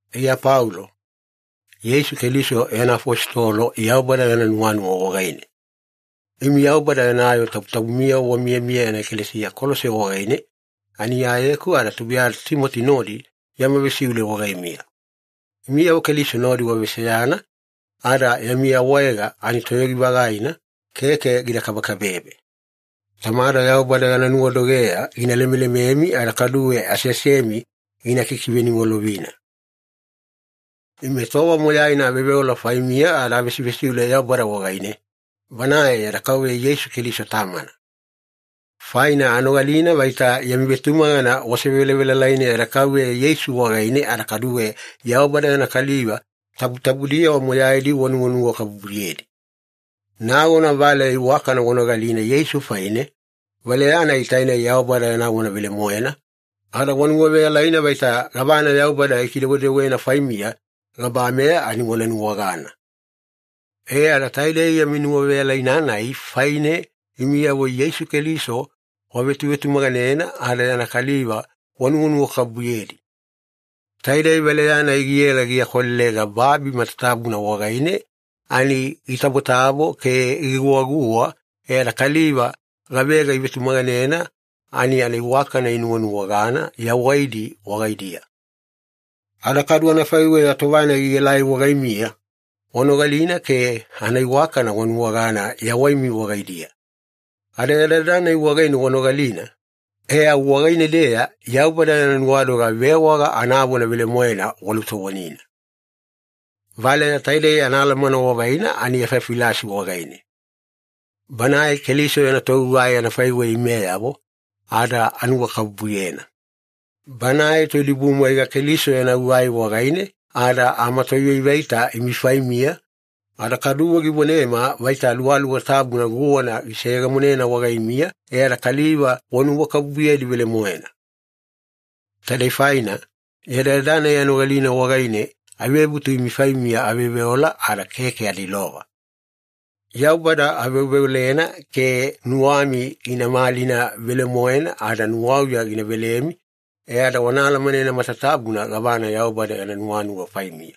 Iya Paulo, Yeisu Keliso yana afositolo Yaubada yana nuwanuwa wagaine. Imi Yaubada yana yoo tabutabumiyavo wamiyamiya yana ekalesiya Kolose wagaine ani Iyayeku ada tubuiyada Timoti nodi yama vesiule wagaimiya. Imiyavo Keliso nodi waveseyana ada yami awaega ani toyogi-vagaina, keke gida kabekabebe. Tamada Yaubada yana nuwadogeya gina lemelememi ada kaduwe aseasemi gina kikiveniwalovina. Ime tova moyaina aveoveola faimiya ada avesivesiule Yaubada wagaine, Banae yada Kauveya Yeisu Keliso Tamana. Faina anogalina vaita yami vetumagana wasevelavelalaina yada Kauveya Yeisu wagaine, ada kaduwe Yaubada yana kaliva tabutabudiyavo moyaidi wanuwanuwakabubuyedi. Nagona valeya iwakana wanogalina Yeisu faine, valeya-nai tainei Yaubada yana vona velemoena, ada wanuwaveyalaina vaita gavana Yaubada gikidewedewena faimiya gabameya ani wana nuwagana. E ada taidei yami nuwaveyalaina-nai faine, imiyavo Yeisu Keliso wavetuvetumaganena ada yana kaliva wanuwanuwakabubuyedi. Taidei valeya-nai giela giakwalelega babi matatabuna wagaine ani gitabotabo ke giguwaguwa, e ada kaliva gavega ivetumaganena ani anaiwakana inuwanuwagana yawaidi wagaidiya. Ada kadu anafaiweya tova-nai gielai wagaimiya, wanogalina ke anaiwakana wanuwagana yawaimi wagaidiya. Ada yadayada-nai wagaine wanogalina, e au wagaine-deya Yaubada yana nuwadoga vewaga anavona velemoena walutovonina. Valeya taidei anaalamana wavaina ani Efafilasi wagaine. Banae Keliso yana togugai anafaiweya imeyavo, ada anuwakabubuyena. Banae toidibumwaiga Keliso yana gugai wagaine ada amatoivaivaita imi faimiya, ada kaduwe givonema vaita Aluwaluwa Tabuna guwana giseyegemonena wagaimiya e ada kaliva wanuwakabubuyedi velemoena. Taidei faina, yadayada-nai anogalina wagaine avebutu imi faimiya aveoveola ada keke ada ilova. Yaubada aveoveolena ke nuwami gina malina velemoena ada nuwauya gina velemi, e ada wana alamanena matatabuna gavana Yaubada yana nuwanuwa faimiya.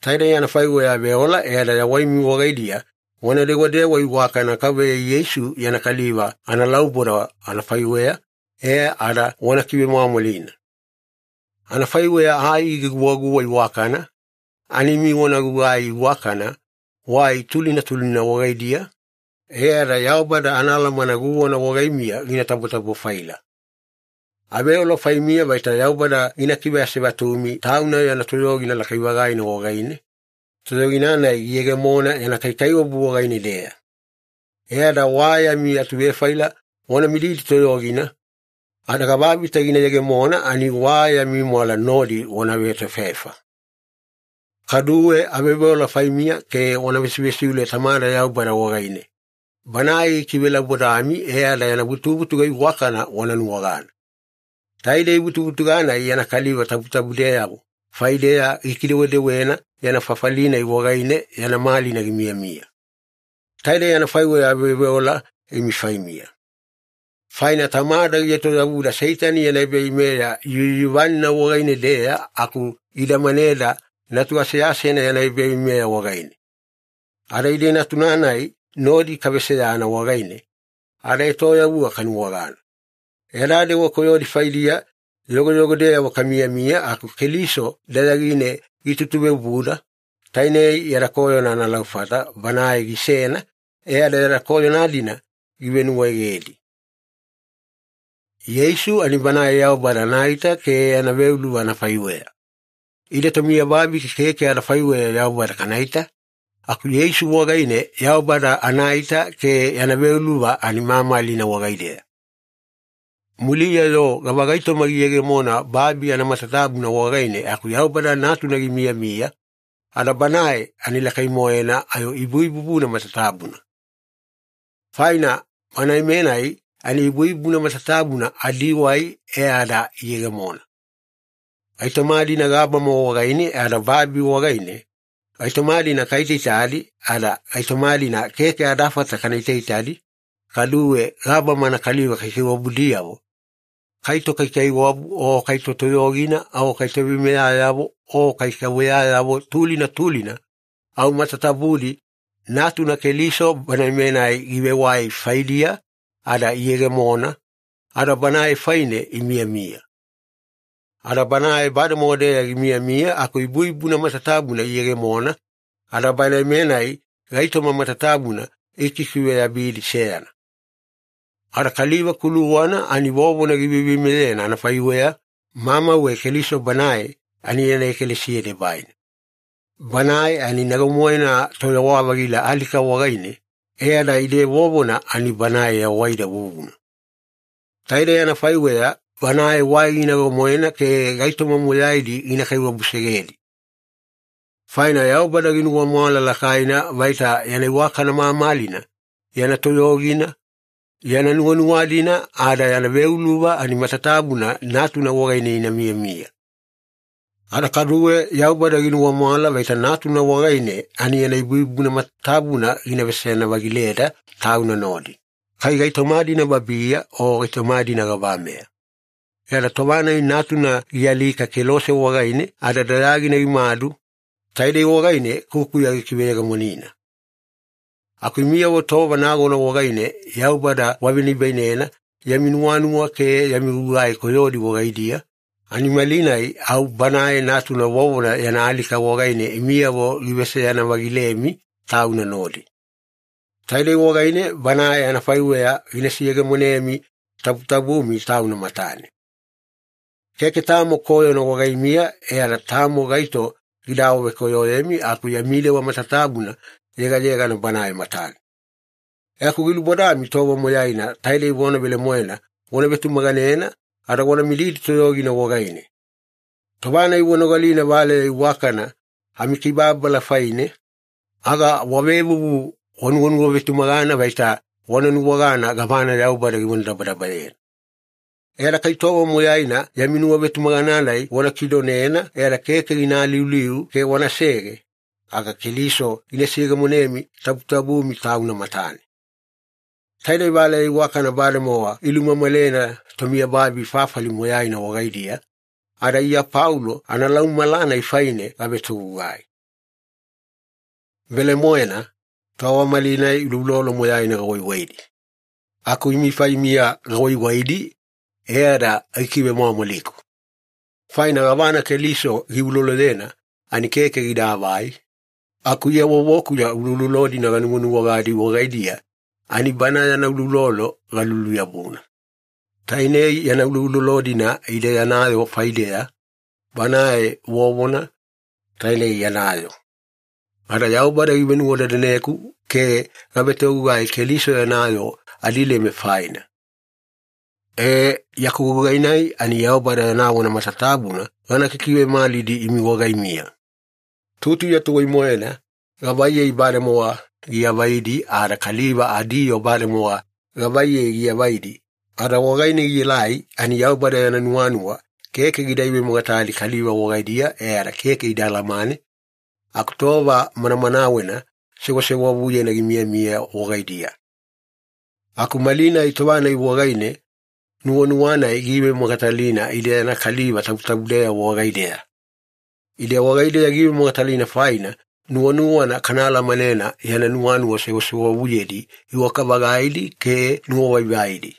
Taidei anafaiweya aveola e ada yawaimi wagaidiya wana dewadewa iwakana Kauveya Yeisu yana kaliva analauboda anafaiweya, e ada wana kivemwamwalina. Anafaiweya ai giguwaguwa iwakana, ani imi wana gugugai iwakana wai tulina tulina wagaidiya, e ada Yaubada anaalamana guwana wagaimiya gina tabotabo-faila. Aveola faimiya vaita Yaubada gina kiveasevatumi Tauna yana toyogina lakai-vagaina wagaine, toyogina-nai giyegemona yana kaikaiwabu wagaine-deya. E ada wa yami atuvefaila wana mididi toyogina, ada gavavita gina yegemona ani wa yami mwala nodi wana vetoefaefa. Kaduwe aveoveola faimiya ke wana vesivesiule Tamada Yaubada wagaine, Banae gikivelaubodami e ada yana vutuvutuga iwakana wana nuwagana. Taidei vutuvutuga-nai yana kaliva tabutabudeyavo faideya gikidewedewena yana fafali-nai wagaine yana malina gimiyamiya. Taidei anafaiweya aveoveola imi faimiya. Faina Tamada gietoyavuda Seitani yana ebaveimeya yuyuvanina wagaine-deya aku gidamaneda Natu aseasena yana ebaveimeya wagaine. Ada ide Natuna-nai nodi kaveseyana wagaine, adaetoyavuga kanuwagana. Yada dewa koyodi faidiya yogoyogodeyavo kamiyamiya aku Keliso dayagine gitutuveobuda, tainei yada koyona analaufata Banae gisena e ada yada koyona-dina givenuwaegedi. Yeisu ani Banae Yaubada anaita ke yana veuluva anafaiweya. Ide tomiyababi keke adafaiweya Yaubada kanaita, aku Yeisu wagaine Yaubada anaita ke yana veuluva ani mamalina wagaideya. Muliya-yo gavagaitoma giyegemona babi anamatatabuna wagaine aku Yaubada Natuna gimiyamiya, ada Banae ani lakai-moena ayo ibuibubuna matatabuna. Faina Banae-menai ani ibuibubuna matatabuna adiwai e ada iyegemona. Gaitoma-dina gabama wagaine ada babi wagaine, gaitoma-dina kaitaitadi ada gaitoma-dina keke adafata kana itaitadi, kaduwe gabama anakaliva kaikaiwabudiyavo, kai tokaikaiwabu, o kai totoyogina, o kai toveimeyayavo, o kai kauveyayavo tulina tulina, au matatabudi Natuna Keliso Banae-menai givewai faidiya ada iyegemona, ada Banae faine imiyamiya. Ada Banae bademowa-deya gimiyamiya aku ibuibubuna matatabuna iyegemona, ada Banae-menai gaitoma matatabuna gikikiveyabidi seyana. Ada kaliva kuluwana ani vovona giveiveimeyena anafaiweya, mamauwe Keliso Banae ani yana ekalesiya debaina. Banae ani nago-moena toyawa-vagila alika wagaine, e ada ide vovona ani Banae yawaida vuvuna. Taidei anafaiweya Banae wai ginago-moena ke gaitoma moyaidi gina kaiwabusegedi. Faina Yaubada ginuwamwala lakaina vaita yana iwakana mamalina, yana toyogina, yana nuwanuwa-dina ada yana veuluva ani matatabuna Natuna wagaine ina miyamiya. Ada kaduwe Yaubada ginuwamwala vaita Natuna wagaine ani yana ibuibubuna matatabuna gina veseyana-vagileda Tauna nodi, kai gaitoma-dina babiya o gaitoma-dina gabameya. E ada tova-nai Natuna gialika kelose wagaine ada dayagina gimadu, taidei wagaine kukuya gikiveyegemonina. Aku imiyavo tova nagona wagaine Yaubada wavenibainena yami nuwanuwa ke yami gugai koyodi wagaidiya, ani malinai au Banae Natuna vovona yana alika wagaine imiyavo giveseyana-vagilemi Tauna nodi. Taidei wagaine Banae anafaiweya gina seyegemonemi tabutabumi Tauna matane. Keke tamo koyona wagaimiya e ada tamo gaito gida awavekoyoyemi aku yami dewa matatabuna yegayegana Banae matane. E aku gilubodami tova moyaina taidei vona velemoena wana vetumaganena ada wana mididi toyogina wagaine. Tova-nai wanogalina valeya iwakana amikibababala faine, aga wavevuvu wanuwanuwavetumagana vaita wana nuwagana gavana Yaubada givonadabadabayena. E ada kai tova moyaina yami nuwavetumagana-nai wana kidonena e ada keke gina aliuliu ke wanasege, aga Keliso gina seyegemonemi tabutabumi Tauna matane. Taidei valeya iwakana bademowa ilumamalena tomiyababi fafali moyaina wagaidiya, ada Iya Paulo analaumamala-nai faine gavetogugai. Velemoena, tova malinai uloulolo moyaina gawaiwaidi. Aku imi faimiya gawaiwaidi e ada gikivemwamwaliku. Faina gavana Keliso giuloloyena ani keke gidaavai, aku Iya vovokuya ulolo-dina ganuwanuwagadi wagaidiya ani Bana yana uloulolo galuluyabuna. Tainei yana uloulolo-dina ide yana yoo faideya, Banae vovona, tainei yana yoo. Ada Yaubada givenuwadadaneku ke gavetogugai Keliso yana yoo adilema faina. Ee, yaku gugai-nai ani Yaubada yana vona matatabuna gana kikivemalidi imi wagaimiya. Tutuya tuwai-moena gavaiyei bademowa giavaidi ada kaliva adiyoo bademowa gavaiyei giavaidi ada wagaine gielai, ani Yaubada yana nuwanuwa keke gida ivemogatali kaliva wagaidiya e ada keke ida alamane, aku tova manamanawena sewasewavuyena gimiyamiya wagaidiya. Aku malinai tova-nai wagaine nuwanuwa-nai giivemogatalina ide yana kaliva tabutabudeyavo wagaideya. Ide wagaideya giivemogatalina faina nuwanuwana kana alamanena yana nuwanuwa sewasewavuyedi iwaka-vagaidi ke nuwavaivaidi.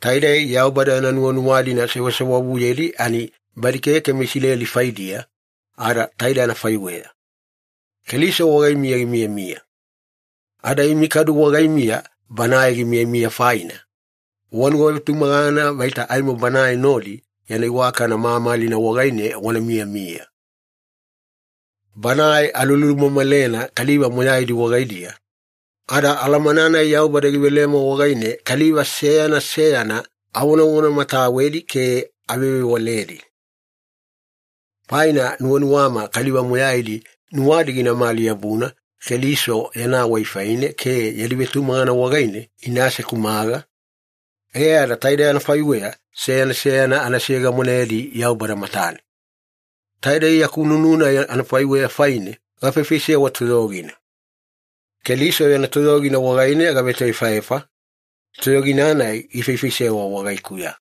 Taidei Yaubada yana nuwanuwa-dina sewasewavuyedi ani badi keke meIsileli faidiya, ada taide anafaiweya. Keliso wagaimiya gimiyamiya. Ada imi kadu wagaimiya Banae gimiyamiya faina, wanuwavetumagana vaita aimo Banae nodi yana iwakana mamalina wagaine wana miyamiya. Banae alulumamalena kaliva moyaidi wagaidiya, ada alamana-nai Yaubada givelema wagaine kaliva seyana seyana avonavonamatawedi ke avevewaledi. Faina nuwanuwama kaliva moyaidi nuwadi ginamali-yabuna Keliso yana wai faine ke yadi vetumagana wagaine ina asekumaga, e ada taide anafaiweya seyana seyana ana seyegemonedi Yaubada matane. Taidei yaku nunu-nai anafaiweya faine gafaifaisewa toyogina. Keliso yana toyogina wagaine gavetoefaefa, toyogina-nai gifaifaisewa wagaikuya.